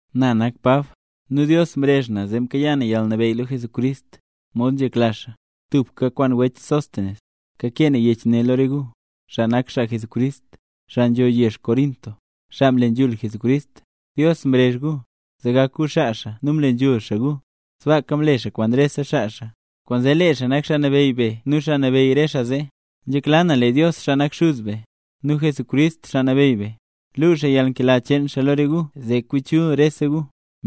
Na nak Pab, nu Dios mrezh na zee mkayaa na yalnabeyy lo Jesucrist, mod nzhekla xaa. Tubka kwaan wech Sóstenes, kakee na yech ne lo re gu, xaa mle nambey Jesús, xaa nzho yezh Corinto. Dios mrezh gu, zee gak gu xaa xaa nu mle nambey xaa gu. Sbaaka mle xaa kwaan rese xaa xaa. Kwaanzee lee xaa nak Xaa Nabeyy be nu Xaa Nabeyy re xaa zee. Nzhekla na lee Dios, xaa nak Xuz be, nu Jesucrist Xaa Nabeyy be, luu xaa yalnkela cheen xaa lo re gu zee kwi chul rese gu.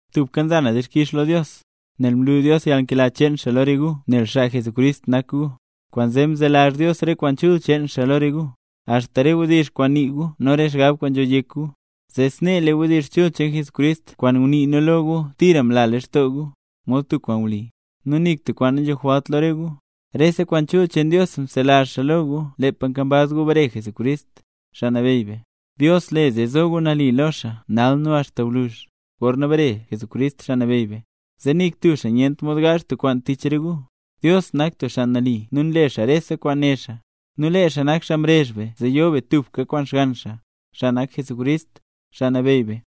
Tubka nza na dixkix lo Dios, nel mlu Dios yalnkela cheen xaa lo re gu nel xaa Jesucrist nak gu. Kwaanzee mzelazh Dios re kwaan chul cheen xaa lo re gu, axta re wdizh kwaan nii gu nu re xgab wen kwaan nzho yek gu. Zee snee lee wdizh chul cheen Jesucrist kwaan ngunii nu lo gu tira mla lextoo gu, mod tub kwaan wli. Nu nik tub kwaan nanzhijwalt lo re gu, rese kwaan chul cheen Dios mzelazh xaa lo gu lepa nkambaz gu bare Jesucrist, Xaa Nabeyy be. Dios le zee zo gu nali lo xaa nal nu axta gwluzh, gorna bare Jesucrist Xaa Nabeyy be, zee nik tub xaa nyent mod gaazh tub kwaan tich re gu. Dios nak tub xaa nali nu nle xaa rese kwaan né xaa. Nu lee xaa nak xaa mrezh be zee yo be tubka kwaan Xgann xaa, xaa nak Jesucrist, Xaa Nabeyy be.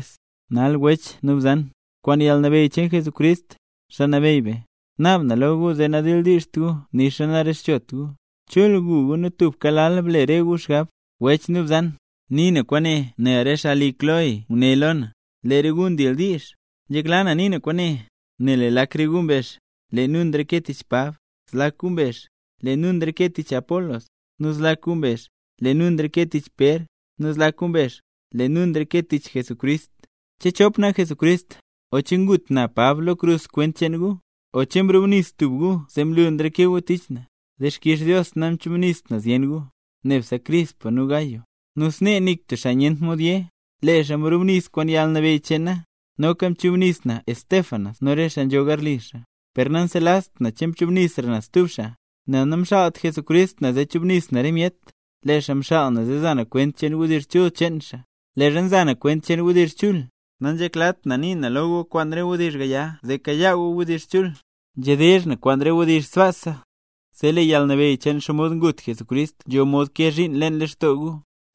Nal wech nu bzan, kwaan yalnabeyy cheen Jesucrist, Xaa Nabeyy be, naab na lo gu zee nadildiizht gu nixa narezhchot gu. Chul gu gu nu tubka lal ble re gu xgab. Wech nu bzan, nii na kwaane nel re xaa li wech Cloé nguné lo na, lee re gu ndildiizh. Nzhekla na nii na kwaane, nel lee lak re gu mbezh: “Lee nu nreke tich Pab”. Zlak gu mbezh: “Lee nu nreke tich Apolos”. Nu zlak gu mbezh: “Lee nu nreke tich Pér”. Nu zlak gu mbezh: “Lee nu nreke tich Jesucrist”. ¿Che chop nak Jesucrist?, o ¿che ngut na, Pab, lo krus kwent cheen gu? ¿O che mrubnis tub gu zee mlu nreke gu tich na? ¡Dixkix Dios namchubnist na zyen gu, nebse wech Crispo nu wech Gayo! Nu snee nik tub xaa nyent mod yé, lee xaa mrubnis kwaan yalnabeyy cheen na. Noka mchubnis na Estéfanas nu re xaa nzho garli xaa, per nanselazht na che mchubnisra na stub xaa. Nel namxaalt Jesucrist na zee chubnis na re myet, lee xaa mxaal na zee za na kwent cheen wdizh chul cheen xaa. Leezha nza na kwent cheen wdizh chul, nanzheklat na nii na lo gu kwaan re wdizh gaya zee kayaa gu wdizh chul. Nzhedizh na kwaan re wdizh sbaasa, zee lee yalnabeyy cheen xomod ngut Jesucrist nzho mod kee zhiin leen lextoo gu.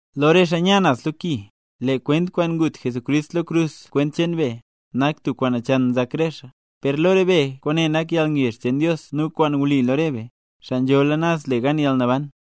Lo re xaa nya naz lo ki, lee kwent kwaan ngut Jesucrist lo krus kwent cheen be, nak tub kwaan nachan nzak re xaa, per lo re be kwaane nak yalngezh cheen Dios nu kwaan wli lo re be, xaa nzhola naz le gan yalnaban.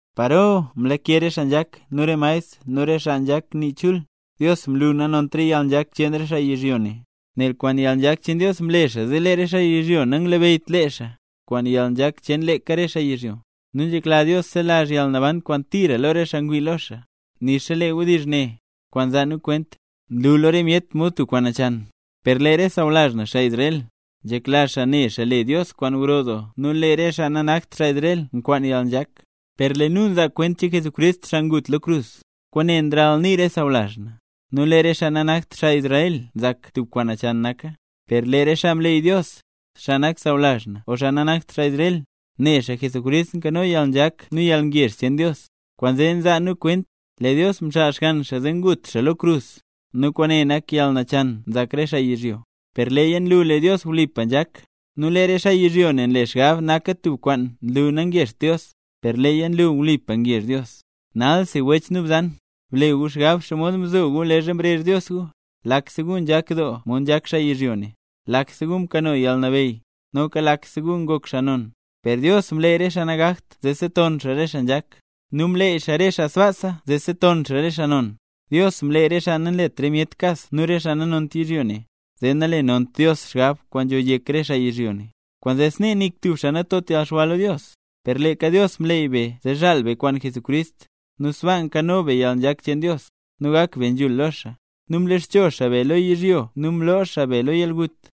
¿Paro mlake re xaa nzhak nu re maestr nu re xaa nzhak nii chul? ¡Dios mlu nanont re yalnzhak cheen re xaa yizhyo ne! Nel kwaan yalnzhak cheen Dios, mle xaa zee lee re xaa yizhyo nanglabeyyt lee xaa, kwaan yalnzhak cheen leeka re xaa yizhyo. Nu nzhekla Dios zelazh yalnaban kwaan tira lo re xaa ngwii lo xaa, nixa lee wdizh ne, kwaan nzaa nu kwent, nlu lo re myet mod tub kwaan nachan. Per lee re sawlazh na, xaa Israel, nzhekla xaa ne xaa le Dios kwaan gro doo nu lee re xaa nanakt xaa Israel nkwaan yalnzhak, per lee nu nzaa kwent cheen Jesucrist, xaa ngut lo krus. Kwaane nralnii re sawlazh na, nu lee re xaa nanakt Israel nzak tub kwaan nachan naka, per lee re xaa mleey Dios, xaa nak sawlazh na o xaa nanakt xaa Israel, ne xaa Jesucrist nkano yalnzhak nu yalngezh cheen Dios. Kwaanzee nzaa nu kwent, lee Dios mxaal Xgann xaa zee ngut xaa lo krus, nu kwaane nak yalnachan nzak re xaa yizhyo, per leeya nlu lee Dios wlipa nzhak; nu lee re xaa yizhyo nle xgab naka tub kwaan nlu nangezht Dios, per leeya nlu wlipa ngezh Dios. Nalsi wech nu bzan, ble gu xgab xomod mzo gu leezha mrezh Dios gu: lakse gu nzhak doo mod nzhak xaa yizhyo ne, lakse gu mkano yalnabeyy, noka lakse gu ngok xaa non. Per Dios mleey re xaa nagakt zee seton xaa re xaa nzhak, nu mleey xaa re xaa sbaasa zee seton xaa re xaa non. Dios mleey re xaa nanlet re myet kas nu re xaa nanont yizhyo ne, zee nalenont Dios xgab kwaan nzho yek re xaa yizhyo ne. Kwaanzee snee nik tub xaa natot yalxwa lo Dios. Per leeka Dios mleey be zee zhaal be kwaan Jesucrist, nu sbaa nkano be yalnzhak cheen Dios, nu gak be nzhul lo xaa. Nu mloxcho xaa be lo yizhyo nu mloo xaa be lo yalgut.